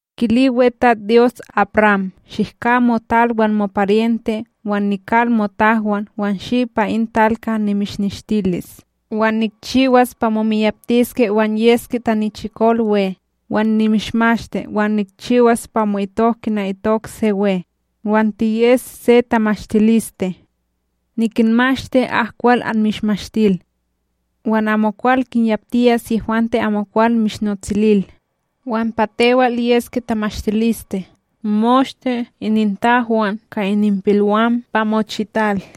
Kili WeTatsDyos AbRam: “Shihka motal, wan moparyente wan nikal motahwan, wan shi pa in tal kaha nimishneshtilis. “Wan nikchiwas pa momiyaptiske wan yeske tanichikol we, Wan nimishmashti; Wan nikchiwas pa mo'itok kina itok se we, wan tiyes se tamashtiliste. nikinmashti ak kwal anmishmashtil wan amokwal kinyaptiyas yehwante amokwal mishnotsilil; Wan pa tewal yeske tamashtiliste moshte inintahwan ka ininpilwam pa mochital!”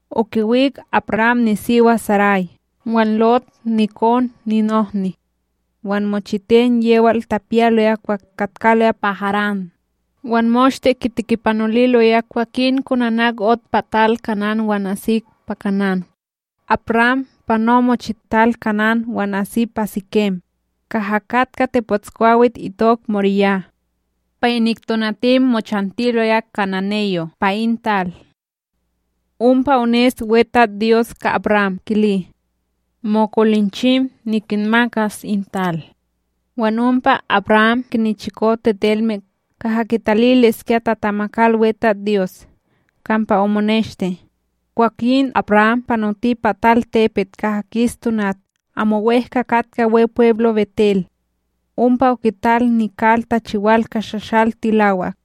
Okiwik AbRam nisiwa Saray, wan Lot nikon ninohni, wan mochiten yewal tapiyaloya kwah katkaloya pa Harán, wan moshte kitikipanoliloya. Kwakin konanak ot pa tal Kanán wan asik pa Kanán, AbRam pano mochital Kanán wan asi pa Sikem, kaha katka tepotskwawit itok MoriYah. Pa inik tonatim, mochantiloya kananeyo' pa in tal. Ompa ones WeTatsDyos ka AbRam kili: “Mokolinchim nikinmakas in tal.” Wan ompa AbRam kinichiko tetelme kaha kitaliliskya tatamakal WeTatsDyos, kampa omoneshti. Kwakin AbRam panoti pa talTepet kaha kis tonat, amo wEhka katka Wepweblo' BetEl. Ompa okital nikal tachiwal ka shashal tilawak.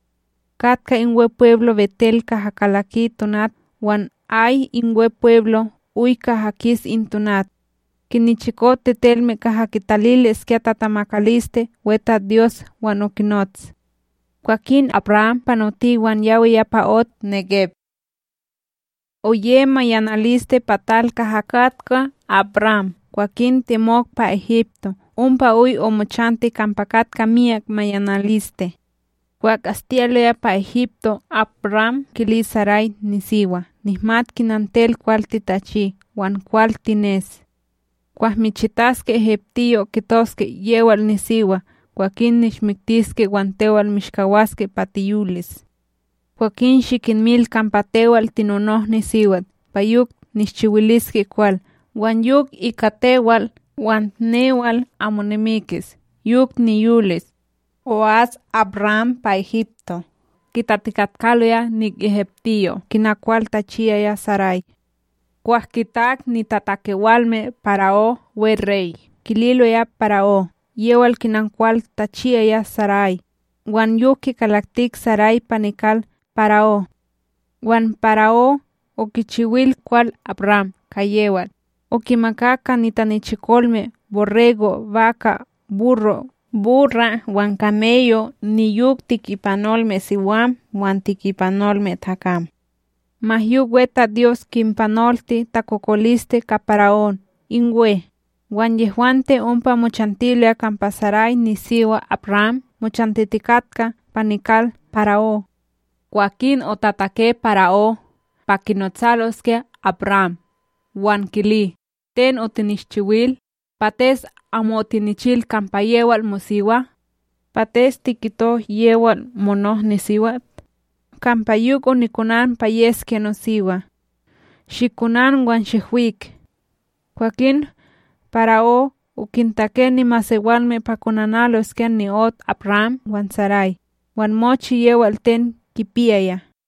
Katka in Wepweblo' BetEl kaha kalaki tonat wan Ay in Wepweblo' oy kaha kis in tonat. Kinichiko tetelme kaha kitaliliskya tatamakaliste WeTatsDyos wan okinots. Kwakin AbRam panoti wan yawiya pa ot Négeb. Oye mayanaliste pa tal kaha katka AbRam kwakin temok pa Egipto, ompa oy omochanti kampa katka miyak mayanaliste. Kwah astiyaloya pa Egipto, AbRam kili Saray nisiwa: “Nihmat kina tewal kwal titachi wan kwal tines. Kwah michitaske egiptiyo', kitoske: ’ Yewal nisiwa’; kwakin nishmiktiske wan tewal mishkawaske pa tiyolis. Kwakin shikinmil kampa tewal tinonohniSiwat, pa yok nishchiwiliske kwal, wan yok ika tewal wan newal amo nimikis, yok niyolis.” O'as AbRam pa Egipto, kitatikatkaloya inik egiptiyo' kina kwal tachiyaya Saray. Kwah kitak nitatakewalme para'ó werey, kililoya para'ó yewal kina kwal tachiyaya Saray, wan yok kikalaktik Saray pa nikal para'ó. Wan para'ó okichiwil kwal AbRam ka yewal, okimakak ka nitanichikolme borrego', baka', burro', burra' wan kameyo' niyok tikipanolmeSiwam wan tikipanolmeTakam. Ma yok WeTatsDyos kinpanolti takokoliste ka para'ó in we, wan yehwante ompa mochantiloya kampa Saray nisiwa AbRam mochantitikatka pa nikal para'ó. Kwakin otatake para'ó pa kinotsaloskya AbRam wan kili: “Ten otinishchiwil? Pates amo otinichil kampa yewal mosiwa? Pates tikito yewal monohniSiwat? Kampa yok onikonan pa yeskya nosiwa! Shikonan wan shihwik!” Kwakin para'ó okintake nimasewalme pa konanaloskya ni'ot AbRam wan Saray, wan mochi yewal ten kipiyaya.